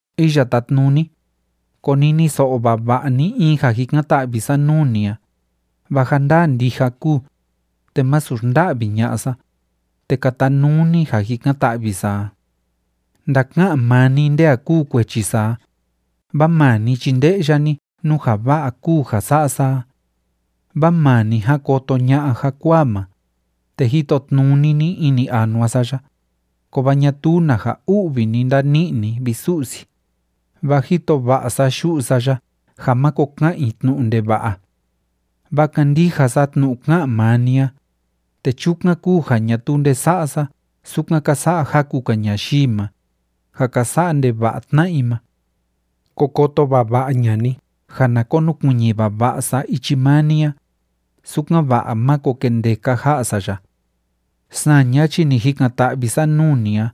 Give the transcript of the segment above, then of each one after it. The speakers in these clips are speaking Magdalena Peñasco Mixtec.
Iya Tátnuni, koniniso'o vava'a ni in ja jikan‑ta'vi sa nuu ni a, vaa ja ndaa ndija kúu, te másu xnda'vi ña'a sa, te katanuu ni ja jikan‑ta'vi sa a. Ndaka'an maa ni nde a kúu kuechi sa a, vaa maa ni chi nde'ya ni nú ja va'a kúu ja sa'a sa a. Vaa maa ni ján koto ña'a jakuaa ma, te jitotnuni ni ini anua sa ya, kovaa ñatuu na ja u'vi ni ndani'i ni, vi Su'si, vaa jito va'a sa yu'u sa ya ja máko ka'an i tnu'u ndeva'a. Vaa kándija sa tnu'u ká'an maa ni a, te chukan kúu ja ñatuu nde sa'a sa sukan ka sa'a jaku‑ka ñayii ma, ja ka sa'a ndeva'a tna'a i ma. Ko koto vava'a ña'a ni ja na konukuiñi vava'a sa ichi maa ni a, sukan‑va'a máko kendeka ja'a sa ya. Saña chi ni jikan‑ta'vi sa nuu ni a,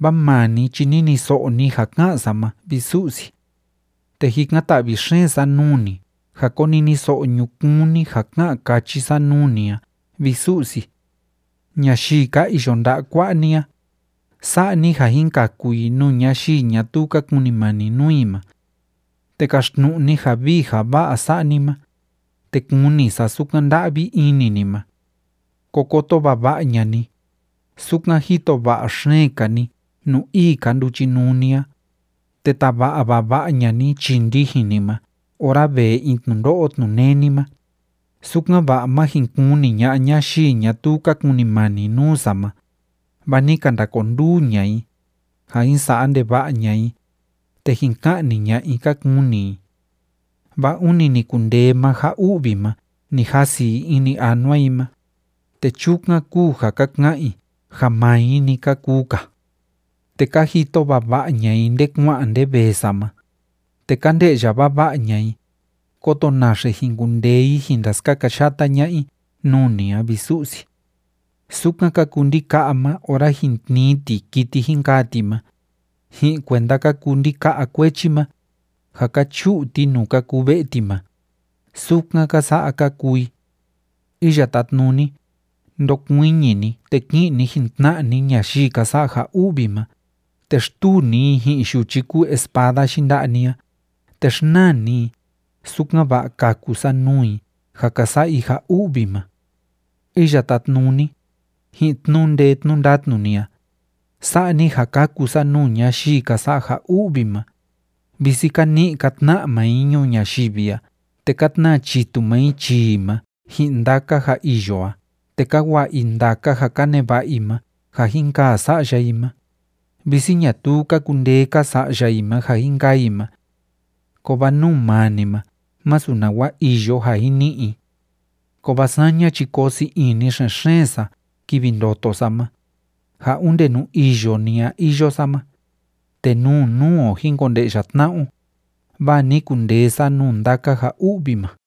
vaa maa ni chi niniso'o ni ja ká'an sa ma, vi Su'si. Te jikan‑ta'vi xeen sa nuu ni ja koniniso'o ñukuun ni ja ká'an káchi sa nuu ni a, vi Su'si. Ñayii ka iyo nda'a kua'a ni a, sa'a ni ja jin kaku i nuu ñayii ñatuu ka kunimani nuu i ma. Te kaxtnu'u ni ja vii ja va'a sa'a ni ma, te kuni sa sukan nda'vi ini ni ma. Ko koto vava'a ña'a ni, sukan jito va'a xeen‑ka ni nuu ii‑ka nduchinuu ni a, te tava'a vava'a ña'a ni chii ndijin ni ma ora vee in tnundo'o tnuneni ma, sukan‑va'a má jin kuni ña'a ñayii ñatuu ka kunimani nuu sa ma, vaa ni ka ndakonduu ña'a i, ja jin sa'a ndeva'a ña'a i, te jin ka'ni ña'a i ka kuni i. Vaa ûni ni kundee maa ja u'vi ma ni jasi i ini anua i ma, te chukan kúu ja ka ka'an i ja maa i‑ni ka kuu‑ka. Te ka jito vava'a ña'a i nde kua'an nde vee sa ma, te ka nde'ya vava'a ña'a i, kóto naxe jin kundee i jin ndaskakayata ña'a i nuu ni a, vi Su'si. Sukan ka kuu ndika'a ma ora jin tnii ti kiti jin kaa ti ma, ji'in kuenda ka kuu ndika'a kuechi ma, ja ka chu'u ti nuu ka kuu ve'e ti ma, sukan ka sa'a ka kuu i. Iya Tátnuni, ndokuiñi ni, te ki'in ni jin‑tna'a ni ñayii ka sa'a ja u'vi ma, te xtuu ni i ji'in yuchi kúu espada yinda'a ni a, te xnaa ni i, sukan‑va'a kaku sa nuu i ja ka sa'a i ja u'vi ma. Iya Tátnuni, ji'in tnu'u ndee tnu'u ndatnu ni a, sa'a ni ja kaku sa nuu ñayii ka sa'a ja u'vi ma, visi ka ni'i ka tna'a maa i ñuu ñayivi a te ka tnaa chitu maa i chii i ma ji'in ndaka ja iyo a te ka wa'a i ndaka ja ka neva'a i ma ja jin kaa sa'ya i ma, visi ñatuu ka kundee‑ka sa'ya i ma ja jin kaa i ma. Kovaa nuu maa ni ma másu nawa iyo ja jin ni'i i. Kovaa saña chi koo sii ini xen‑xeen sa kivi ndoto sa ma, ja onde nuu iyo ni a iyo sa ma, te nuu nuu o jin konde'ya tna'a o, vaa ni kundee sa nuu ndaka ja u'vi ma.